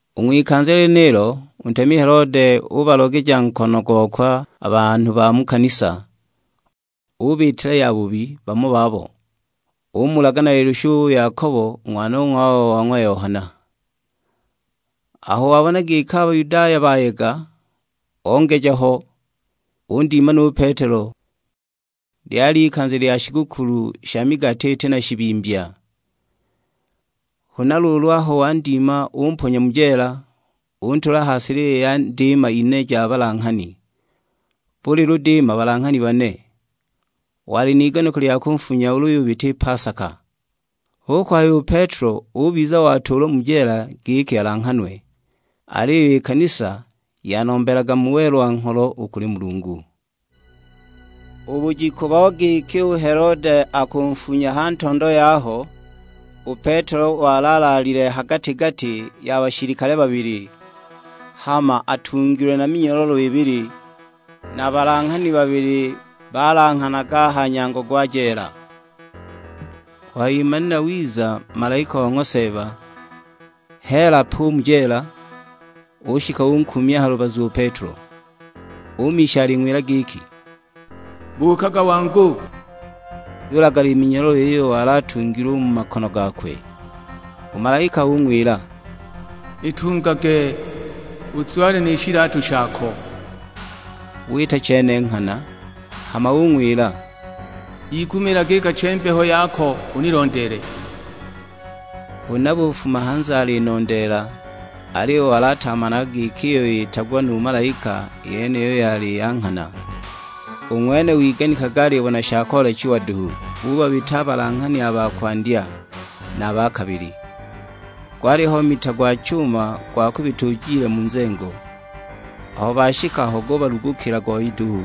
U ng'wikanza lyenilo, u ntemi Helode ubalogeja nkono gokwe a banhu ba mu kanisa; ubiitila yabubi bamo babo. Umulaga na lilushu u Yakobo, u ng'wanong'wawe wa ng'wa Yohana. Aho wabona giki a Bayudaya bayega, ongeja ho; undima nu Petelo, (lyali ikanza lya shigukulu sha migati iti na shibimbya.) Huna luulu aho wandima umponya mu jeela, untuula ha silili ya ndiima ine ja balanghani, buli ludiima balanghani bane. Wali n'iganiko lya kunfunya ulu yubita i pasaka. Hu kuhaya u Petelo ubiza watuulwa mu jeela giki alanghanwe; aliyo i kanisa yanombelaga mu welwa-ngholo u kuli Mulungu. U bujiku bo giki u Helode akunfunya ha ntondo yaho, u Petelo wali alaalile ha gati-gati ya bashilikale babili, hama atungilwe na minyololo ibili, na balanghani babili balanghanaga a ha nyango gwa jeela. Kuhayimanila wiza malaika o ng'wa Seeba; heela pe u mu jeela, ushika unkuumya ha lubazu u Petelo. Umisha aling'wila giki, "Buukaga wangu." Yulagala i minyololo iyo wali atungilwe u mu makono gakwe. U malaika ung'wila, "Itungage, uzwale ni shilatu shako." Wita chene nghana. Hama ung'wila, "Yigumiilage i kache-mbeho yako unilondeele." Huna bufuma hanze alinondeela, aliyo wali atamanaga giki iyo yitagwa nu malaika yeniyo yali ya nghana; u ng'wene wiganikaga alibona sha koolechiwa duhu. Bubabita a balanghani a ba kwandya, na a ba kabili. Gwaliho mita gwa chuma gwa kubita ujile mu nzengo; aho bashika ho gubalugukila goyi duhu,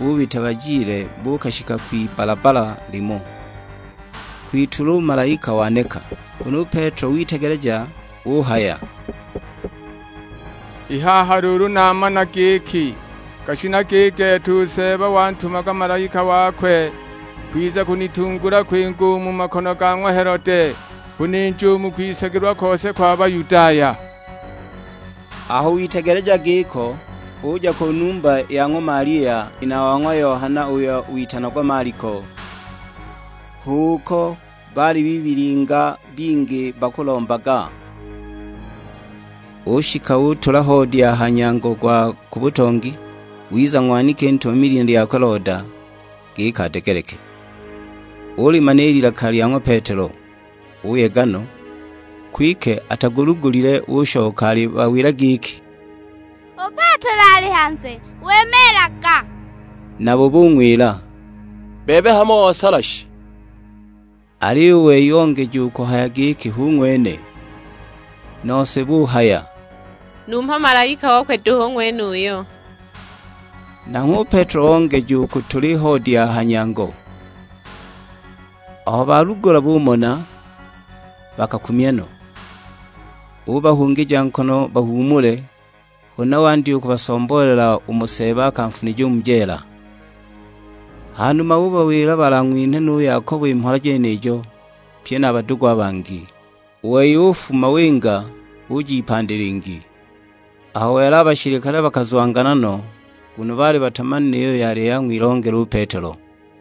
bubita bajile buukashika kwibbalabbala limo; kwitulwa u malaika waneka. Huna u Petelo witegeleja; uhaya, "I haha luulu namana giki, gashinaga i gete u Seeba wantumaga malaika wakwe, kwiza kunitungula kwinga u mu makono ga ng'wa Helode, kuninja u mu kwisagilwa kose kwa Bayudaya." Aho witegeleja giko, uja ku numba ya ng'wa Malia, nina wa ng'wa Yohana uyo witanagwa Maliko; hu uko baali bibilinga bingi bakulombaga. Ushika utula hoodi a ha nyango gwa ku butongi, wiza ng'waniki ntumami lina lyakwe Loda, giki adegeleke. Ulimana i lilaka lya ng'wa Petelo, uyega no; kwike atalugulile, ushoka alibawila giki; "U Petelo ali hanze wimiilaga." Nabo bung'wila, "Bebe hamo osala shi!" Aliyo u wei ongeja u kuhaya giki hu ng'wene; nose buhaya, "Numho malaika okwe duhu u ng'wenuyo!" Nanghwe u Petelo ongeja u kutula i hoodi a ha nyango. Aho balugula bumona, bakakumya no! Ubahungija nkono bahuumule, huna wandya u kubasomboolela umo Seeba akanfunija u mu jeela. Hanuma ubawila balang'winhe nu Yakobo i mhola jenijo, pye na a badugu a bangi. U wei ufuma, winga; uja ipandi lingi. Aho wela a bashilikale bakazwangana no, nguno baali batamanile iyo yali yang'wilongela u Petelo.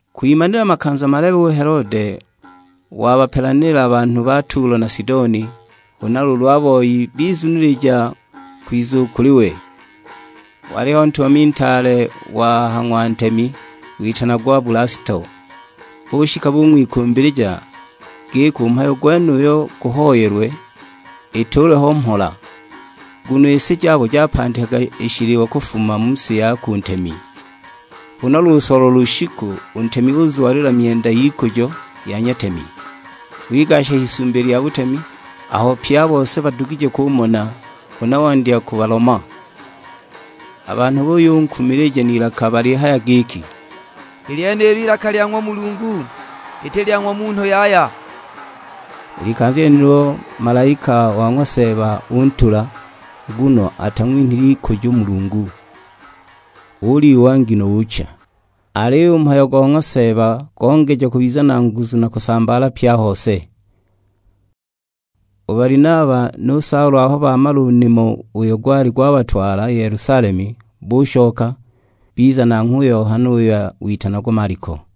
Kwimanila makanza malebe u Helode wabapelanila banhu ba Tulo na Sidoni; huna luulu a boi bizunilija kwiza u kuli we. Waliho ntumami ntaale wa ha ng'wa ntemi, witanagwa Bulasto, bushika bung'wikumbilija, giki u mhayo gwenuyo guhoyelwe ituulwe ho mhola; nguno i si jabo japandikaga i shiliwa kufuma mu si yakwe u ntemi. Huna lusolwa lushiku, u ntemi uzwalila myenda y'ikujo, ya nyatemi. Wigasha h'isumbi lya butemi, aho pye a bose badugije kumona, huna wandya kubaloma! A banhu buyunkumilija n'ilaka balihaya giki, "I lyenilo ilaka lya ng'wa mulungu, liti lya ng'wa munhu yaya!" I likanza lyenilo malaika wa ng'wa Seeba untula, nguno atang'winhile ikujo u Mulungu; ulyiwa ngino ucha! Aliyo u mhayo go ng'wa Seeba gongeja kubiza na nguzu na kusambaala pye a hose. U Balinaba nu Saulo aho bamala u nimo uyo gwali gwabatwala i Yelusalemu, bushoka; biza nanghwe u Yohana uyo witanagwa Maliko.